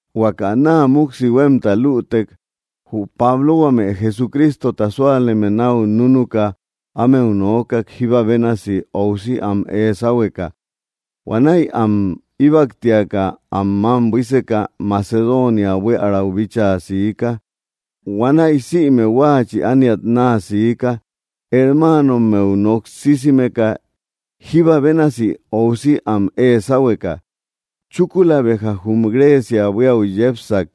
Huaka naa muksi huemta luútek, jü Pablo huame Jesucrístota súaleme nau núnuka ámeu noókak jíba bénasi óusi am ée sáhueka. Huanäi am íbaktiaka am mam buíseka, Macedonia buiärau bíchaa siika. Huanäi sïme huáachï ániat naa siika hermáanommeu noksísimeka, jíba bénasi óusi am ée sáhueka. Chúkula béja jum Grécia buiäu yépsak.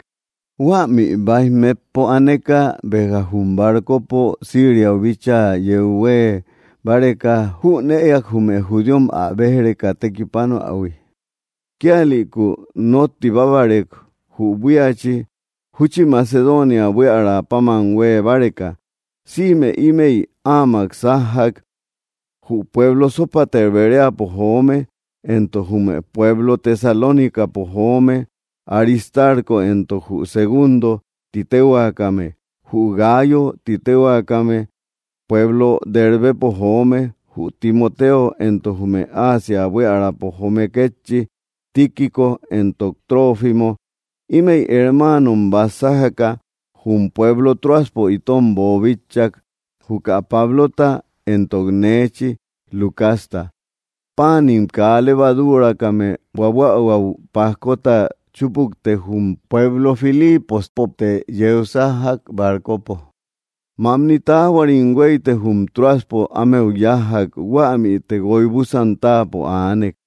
Huämi baij metpo aneka, béja jum barcopo síriau bíchaa yeu huee báreka, jünëak jume judíom ä béj‑reka tekipánoähui. Kíalïku notibábarek jü buíachi, júchi Macedonia buíara pamam huee báreka. Sïme ímëi áamak sájjak: jü pueblo Sópater Beréapo joome, éntok jume pueblo Tesalónicapo joome Aristarko éntok jü Segúndo ti téhuakame, jü Gáayo ti téhuakame pueblo Dérbepo joome, jü Timoteo, éntok jume ásia buiärapo joome kétchi Tíquico éntok Trófimo. Ímëi hermáanom bat sájaka jum pueblo Tróaspo itom boobítchak, juka Pablota éntok néechi Lucasta. Páanim kaa levadúrakame buabuähuäu pájkota chúpukte jum pueblo Filípospote yeu sájjak barcopo. Mamni taáhuarim hueite jum Tróaspo ámeu yájjak. Huämite guoibusan táapo aanek.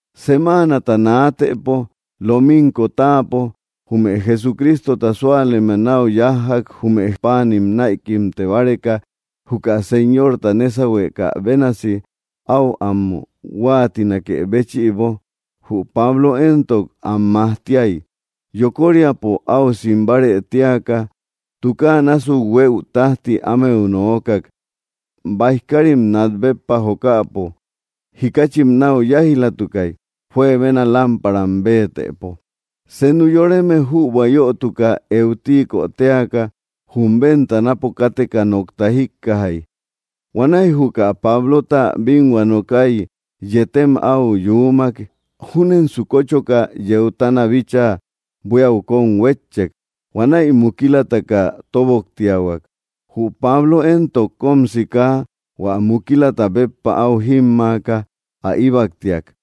Semáanata naatëpo, lominko táapo, jume Jesucrístota súaleme nau yájjak jume páanim näikimte báreka juka Señorta nésauhuekä bénasi au am huáatinakë béchïbo. Jü Pablo éntok, am majtíai. Yokóriapo au simbárë tíaka tukáa násuk huëu tajti ámeu noókak. Baij kárim nat béppa jokäpo jikáchim nau yáij‑latukai, juebena lámparam béetëpo. Senu yoreme jübua yötuka, Euticö téaka, jum ventanapo káteka nokta jíkkajai. Huanäi juka Pablota binhua nokái, yetem au yuumak. Júnensu kóchoka yeutana bíchaa buíau kom huétchek. Huanäi mukílataka tóboktiahuak. Jü Pablo éntok, kom siká, hua mukílata béppa au jímmaaka ä íbaktiak.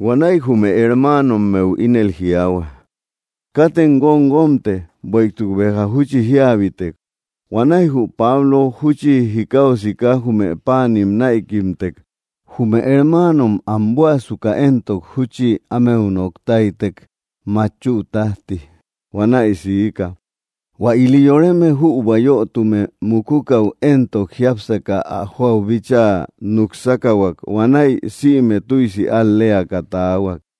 Huanäi jume hermáanommeu ínel jiaahua: —Katem guomguomte, bueïtuk béja júchi jíabitek. Huanäi jü Pablo júchi jikáu siká jume páanim näikimtek. Jume hermáanom am buäsuka éntok, júchi ámeu noktáitek matchüu tajti. Huanäi siika. Huä ili yoreme jübua yötume mukúkäu éntok, jiápsaka ä joau bíchaa nuksákahuak. Huanäi sïme tüisi al‑léaka taahuak.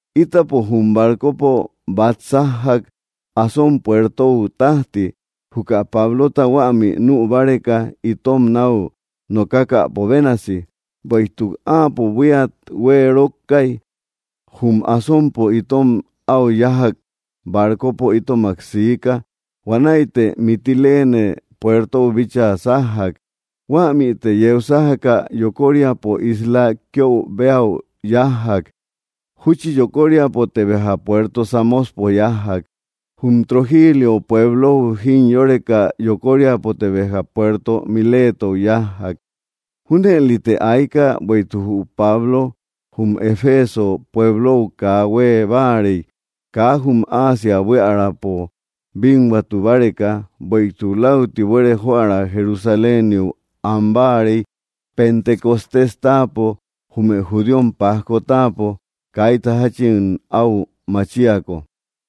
Ítapo jum barcopo bat sájjak Asón puertou tajti, juka Pablota huämi nü báreka itom nau nokákäpo bénasi, bueïtuk áapo buíat hueerokkai. Jum Asonpo itom au yájak, barcopo itomak siika, huanäite Mitiléne puertou bíchaa sájjak. Huämite yeu sájaka yokóriapo isla Quiöu béa yájjak. Júchi yokóriapote béja puerto Sámospo yájjak. Jum Trogílio pueblou jimyóreka yokóriapote béja puerto Miletou yájjak. Júnëlite aika bueïtuk jü Pablo jum Eféso pueblou kaa huee báarei, kaa jum Asia buíaräpo binhuatu báreka, bueïtuk läuti buere joära Jerusaléniu an báarei Pentecostés táapo, jume judíom pajko táapo, kaita jachin au macháiko.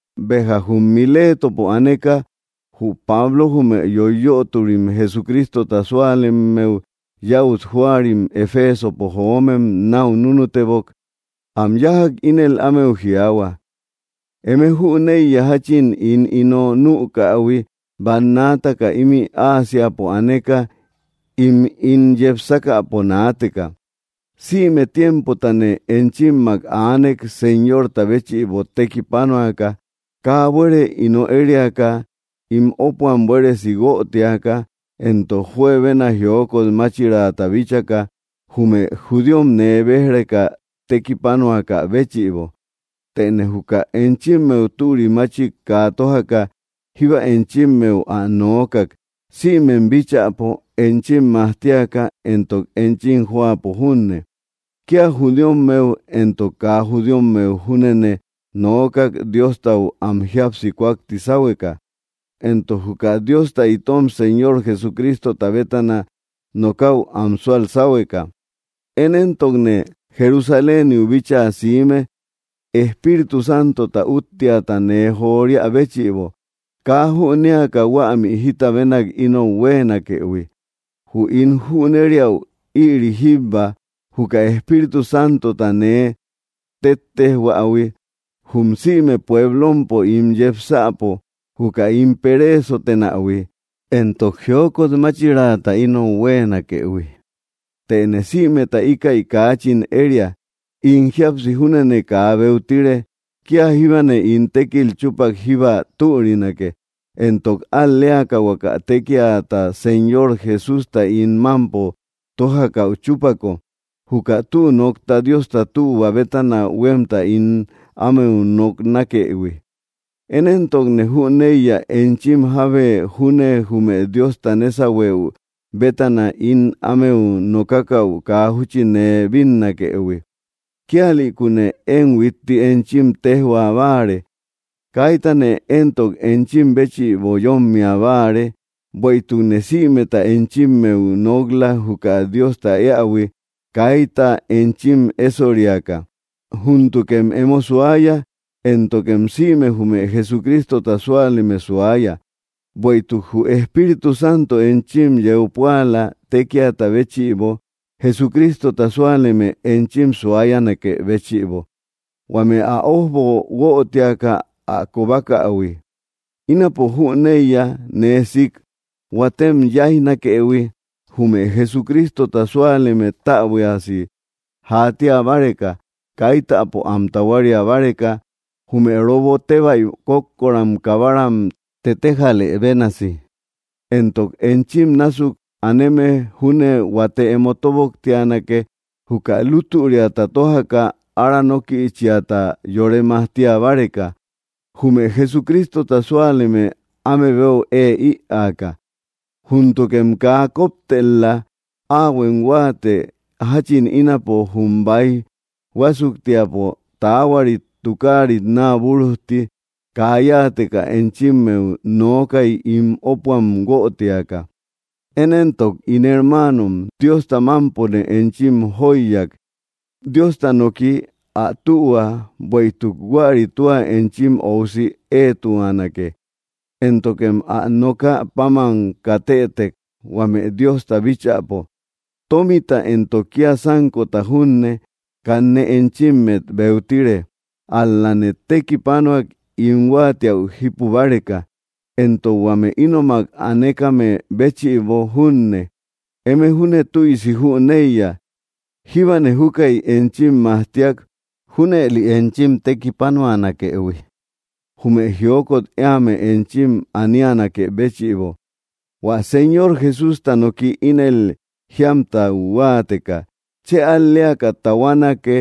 Béja jum Milétopo aneka jü Pablo jume yoiyöturi Jesucrístota súalemmeu yäut jóarim Efesopo joómem nau núnutebok. Am yájak, ínel ámeu jiaahua: —Eme jüneiya jachin ín ino nükähui bannaataka ímï Ásiapo aneka im ín yepsákäpo naateka. Sïme tiémpotane enchimmak aanek Señorta béchïbo tekipánoaka kaa buere ino ériaka, ín ópuam buéresi huötiaka, éntok juebena jiókot máchirata bíchaka jume judíom nee béj‑reka tekipánoakä béchïbo. Tëne juka enchimmeu türi máchik kaa tójaka jíba enchimmeu ä noókak, sïmem bíchäpo enchim majtíaka éntok enchim jóapo junne. Kia judíommeu entok kaa judíommeu júnene noókak Diostau am jíapsi kúakti sáhueka, éntok juka Diosta itom Señor Jesucrístota bétana nokäu am súal sáhueka. Én éntokne Jerusaléniu bíchaa siime Espíritu Santota útteata nee joríä béchïbo, kaa jünéaka huämi jita bénak inou huéenakëhui. Jü ín jünériäu ïri jíbba, juka Espíritu Santota nee tettéjhuähui jum sïme puéblompo ín yepsäpo, juka ín peréesotenähui éntok jiókot máchirata inou huéenakëhui. Tëne sïmeta íkäi kaachin eriä. In jíapsi júnene kaa beutire. Kia jíbane ín tékil chúpak jíba türinake, éntok al‑léaka huaka tékiata Señor Jesústa ín mampo tójakäu chúpako, juka tü nokta Diosta tühua bétana huemta ín ámeu noknákëhui. ’Én éntokne jüneiya énchim jábe júne jume Diosta nésauhuëu bétana ín ámeu nokákäu kaa júchi nee bínnakëhui. Kíalïkune én huitti enchim téjhua báare, kaítane entok enchim béchïbo yómmia báare, bueïtukne sïmeta enchimmeu nok‑la juka Diosta éähui, kaita enchim éssoriaka. Júntukem emo suaya, éntokem sïme jume Jesucrístota súaleme suaya, bueïtuk jü Espíritu Santo enchim yeu púala tékiata béchïbo, Jesucrístota súaleme enchim suáyanakë béchïbo, huame ä ojbo huötiaka ä kobákähui. Ínapo jüneiya nee siik, huátem yáijnakëhui jume Jesucrístota súaleme täbuiasi jatía báreka, kaitäpo am tahuária báreka jume robo tebai kókkoram kabáram tetéjalë bénasi. Éntok enchim násuk aneme júne huate emo tóboktianake juka lútüriata tójaka aranókïchiata yore majtía báreka, jume Jesucrístota súaleme áme beu ée ïaaka. Júntukem kaa koptel‑la. Áahuem huáate jachim ínapo jum baij huásuktiapo, taáhuarit tukáarit naabúrujti, kaa yáateka enchimmeu nookai ín ópuam guötiaka. ’Én éntok, ín hermaanom, Diosta mámpone enchim jóiyak, Diosta noki, ä tühua, bueïtuk huäri tua enchim óusi éetuanake, éntokem ä nokä páman katëtek huame Diosta bíchäpo. Tómita éntok kia sánkota junne, kanne enchimmet beutire. Ál‑lane tekipanuak ín huáatiäu jípu báreka, éntok huame ínomak anékame béchïbo junne. Eme júne tüisi jüneiya. Jíbane júkäi enchim majtíak junëli enchim tekipanuanakëhui jume jiókot éame enchim aníanakë béchïbo, hua Señor Jesústa noki ínel jíamtau huáateka: “Chë al‑léaka tahuánake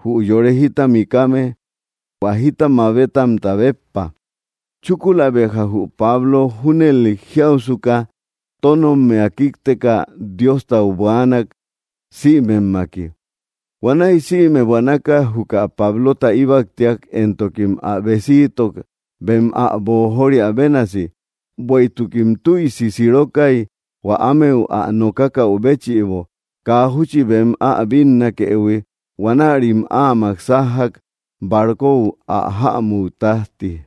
jü yore jita mikame hua jita mabétamta béppa.” Chúkula béja jü Pablo junëli jiáusuka, tónommia kíkteka Diostau buaanak sïmemmaki. Huanäi sïme buanaka juka Pablota íbaktiak, éntokim ä besíitok bem ä boojóriaï bénasi. Bueïtukim tüisi sirokai hua ámeu ä nokákäu béchïbo, kaa júchi bem ä bínnahuëhui. Huanärim áamak sájjak barkóu ä jämú tajti.